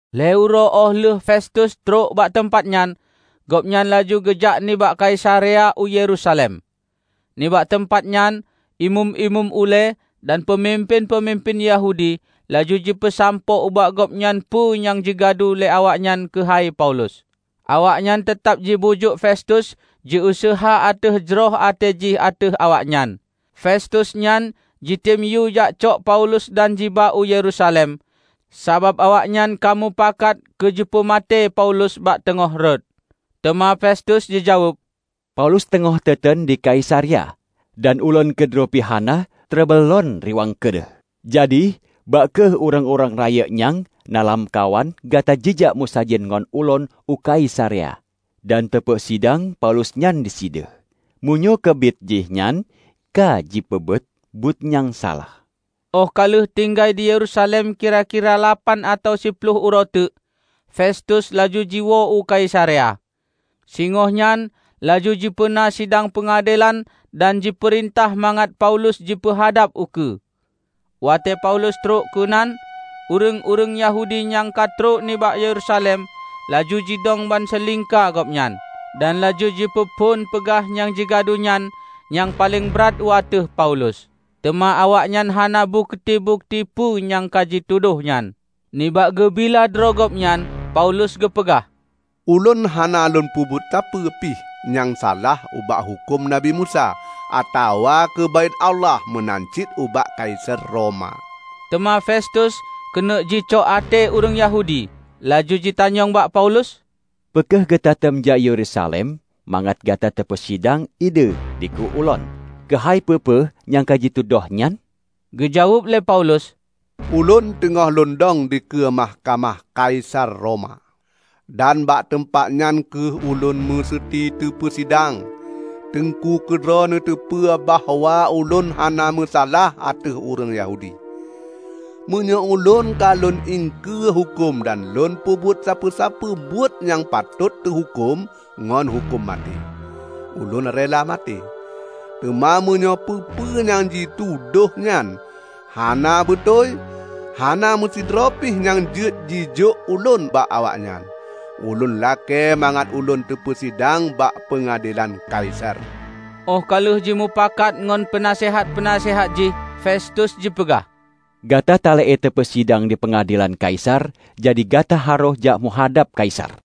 Lhée uroe óh lheueh Festus trok bak teumpat nyan, gobnyan laju geujak nibak Kaisarea u Yerusalem. Nibak teumpat nyan Imeum-imeum ulée dan peumimpén-peumimpén Yahudi laju jipeusampoe ubak gobnyan peue nyang jigadu lé awaknyan keuhai Paulus. Awaknyan teutab jibujuk Festus jiuseuha ateueh jroh até jih ateueh awaknyan, Festus nyan jitem yue jakcok Paulus dan jiba u Yerusalem; sabab awaknyan ka mupakat keu jipeumaté Paulus bak teungoh rot. Teuma Festus jijaweueb, "Paulus teungoh teuteun di Kaisarea; dan ulôn keudroe pih hana treble lôn riwang keudeh. Jadi, bah kheueh ureuëng-ureuëng rayeuk nyang na lamkawan gata jijak meusajan ngon ulôn u Kaisarea dan teupeusidang Paulus nyan disideh, meunyoe keubiet jihnyan ka jipeubuet buet nyang salah." Óh ka lheueh tinggai di Yerusalem kira-kira lapan atawa siploh uroe teuk, Festus laju jiwoe u Kaisarea. Singohnyan laju jipeuna sidang peungadelan dan jipeurintah mangat Paulus jipeuhadab ukeue. Watée Paulus trok keunan, ureuëng-ureuëng Yahudi nyang ka trok nibak Yerusalem laju jidong bansilingka gobnyan, dan laju jipeuphon peugah nyang jigadu nyan nyang paleng brat u ateueh Paulus. Teuma awaknyan hana bukeuti-bukeuti peue nyang ka jitudôh nyan. Nibak geubila droe gobnyan, Paulus geupeugah, "Ulôn hana lôn peubuet sapeue pih nyang salah ubak huköm Nabi Musa atawa keu Baét Allah meunan cit ubak Kaisar Roma." Teuma Festus keuneuk jicok até ureuëng Yahudi. Laju jitanyong bak Paulus, "Peu kheueh gatatem jak u Yerusalem mangat gata teupeusidang ideh dikeue ulôn keuhai peue-peue nyang ka jitudôh nyan?" Geujaweueb lé Paulus, "Ulôn teungoh lôn dong dikeue mahkamah Kaisar Roma; dan bak teumpat nyan kheueh ulôn museuti teupeusidang. Teungku keudroe neuteupeue bahwa ulôn hana meusalah ateueh ureuëng Yahudi. Meunyoe ulôn ka lôn iengkeue huköm dan lôn peubuet sapeue-sapeue buet nyang patot teuhuköm ngon huköm maté, ulôn rela maté. Teuma meunyoe peue-peue nyang jitudôh nyan hana beutôi, hana meusidroe pih nyang jeuet jijôk ulôn bak awaknyan. Ulôn lakée mangat ulôn teupeusidang bak peungadelan Kaisar!" Óh ka lheueh jimeupakat ngon peunaseuhat-peunaseuhat jih, Festus jipeugah, "Gata talakée teupeusidang dipeungadelan Kaisar, jadi gata harôh jak meuhadab Kaisar."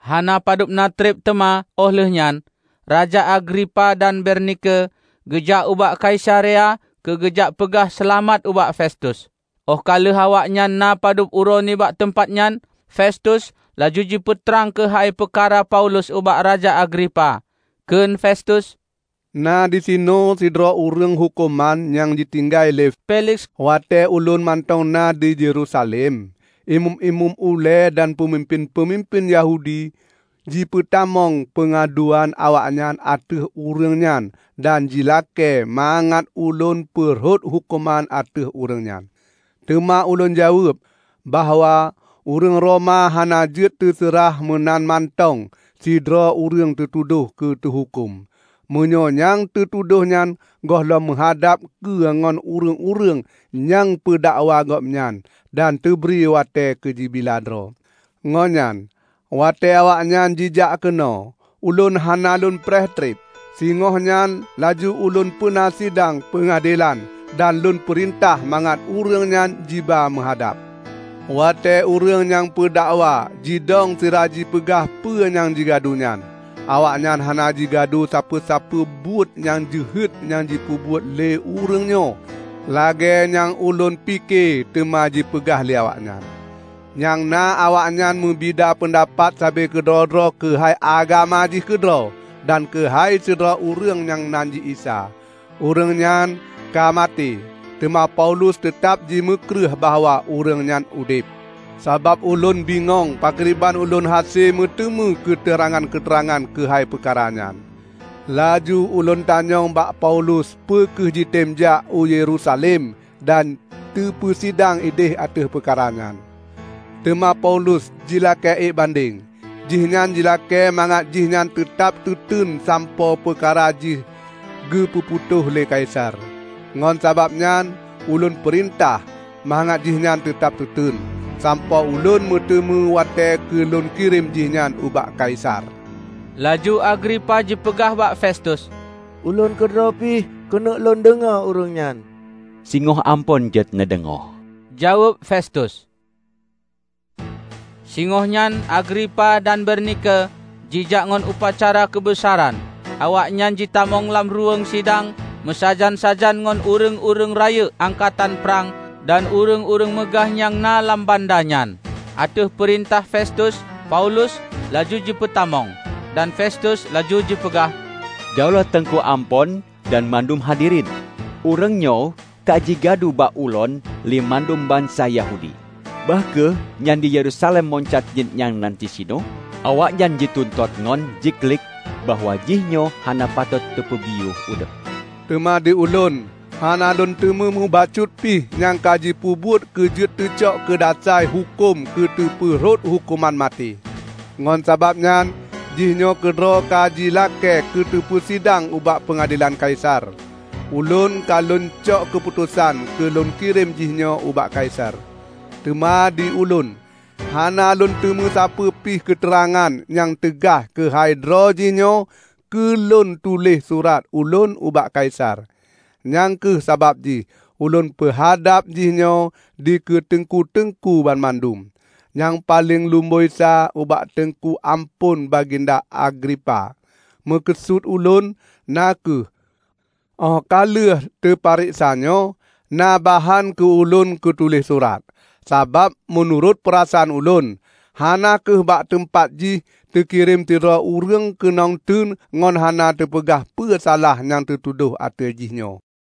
Hana padubna treb teuma óh lheueh nyan, Raja Agripa dan Bernike geujak ubak Kaisarea keu geujak peugah seulamat ubak Festus. Óh ka lheueh awaknyan na padub uroe nibak teumpat nyan, Festus laju jipeutrang keuhai peukara Paulus ubak Raja Agripa. Kheun Festus, "Na disinoe sidroe ureuëng huköman nyang jitinggai lé Feliks. Watée ulôn mantong na di Yerusalem, imeum-imeum ulée dan peumimpén-peumimpén Yahudi jipeutamong peungaduan awaknyan ateueh ureuëng nyan dan jilakée mangat ulôn peurhot huköman ateueh ureuëng nyan. Teuma ulôn jaweueb bahwa ureuëng Roma hana jeuet teuseurah meunan mantong sidroe ureuëng teutudoh keu teuhuköm, meunyoe nyang teutudoh nyan gohlom meuhadab keue ngon ureuëng-ureuëng nyang peudakwa gobnyan dan teubri watée keu jibila droe. Ngon nyan, watée awaknyan jijak keunoe, ulôn hana lôn preh treb. Singohnyan laju ulôn peuna sidang peungadelan dan lôn peurintah mangat ureuëng nyan jiba meuhadab. Watée ureuëng nyang peudakwa jidong sira jipeugah peu nyang jigadu nyan, awaknyan hana jigadu sapeue-sapeue buet nyang jeuhet nyang jipeubuet lé ureuëng nyoe lagée nyang ulôn pike teuma jipeugah lé awaknyan. Nyang na awaknyan meubida peundapat sabe keudroe-droe keuhai agama jih keudroe dan keuhai sidroe ureuëng nyang nan jih Isa. Ureuëng nyan ka maté, teuma Paulus teutab jimeukreueh bahwa ureuëng nyan udeb. Sabab ulôn bingong pakriban ulôn hase meuteumé keuteurangan-keuteurangan keuhai peukara nyan, laju ulôn tanyong bak Paulus peu kheueh jitem jak u Yerusalem dan teupeusidang ideh ateueh peukara nyan. Teuma Paulus jilakée ék bandeng; jihnyan jilakée mangat jihnyan teutab teuteun sampoe peukara jih geupeu putôh lé Kaisar. Ngon sabab nyan ulôn peurintah mangat jihnyan teutab teuteun, sampoe ulôn meuteumé watée keu lôn kirém jihnyan ubak Kaisar." Laju Agripa jipeugah bak Festus, "Ulôn keudroe pih keuneuk lôn deungoe ureuëng nyan." "Singoh Amphon jeuet neudeungoe," jaweueb Festus. Singohnyan Agripa dan Bernike jijak ngon upacara keubeusaran. Awaknyan jitamong lam ruweueng sidang meusajan-sajan ngon ureuëng-ureuëng rayeuk angkatan prang dan ureuëng-ureuëng meugah nyang na lam banda nyan. Ateueh peurintah Festus, Paulus laju jipeutamong. Dan Festus laju jipeugah, "Daulat Teungku Amphon dan mandum hadirin! Ureuëngnyoe ka jigadu bak ulôn lé mandum bansa Yahudi, bah kheueh nyan di Yerusalem meunan cit nyang na disinoe. Awaknyan jituntot ngon jiklik-klik bahwa jihnyoe hana patot teupeubiyeu udeb. Teuma di ulôn hana lôn teumé mubacut pin nyang ka jipeubuet keu jeuet teucok keudasai huköm keu teupeu rhot huköman maté. Ngon sabab nyan jihnyoe keudroe ka jilakée keu teupeusidang ubak peungadelan Kaisar, ulôn ka lôn cok keuputosan keu lôn kirém jihnyoe ubak Kaisar. Teuma di ulôn hana lôn teumé sapeue pih keuteurangan nyang teugaih keuhai droe jihnyoe keu lôn tuléh surat ulôn ubak Kaisar. Nyang kheueh sabab jih ulôn peuhadab jihnyoe dikeue Teungku-teungku banmandum, nyang paleng lumboi sa ubak Teungku Amphon Baginda Agripa! Meukeusut ulôn na kheueh óh ka lheueh teupareksanyoe, na bahan keu ulôn kutuléh surat. Sabab meunurot peurasaan ulôn, hana kheueh bak teumpat jih teukirém sidroe ureuëng keunong teun ngon hana teupeugah peu salah nyang teutudoh ateueh jihnyoe."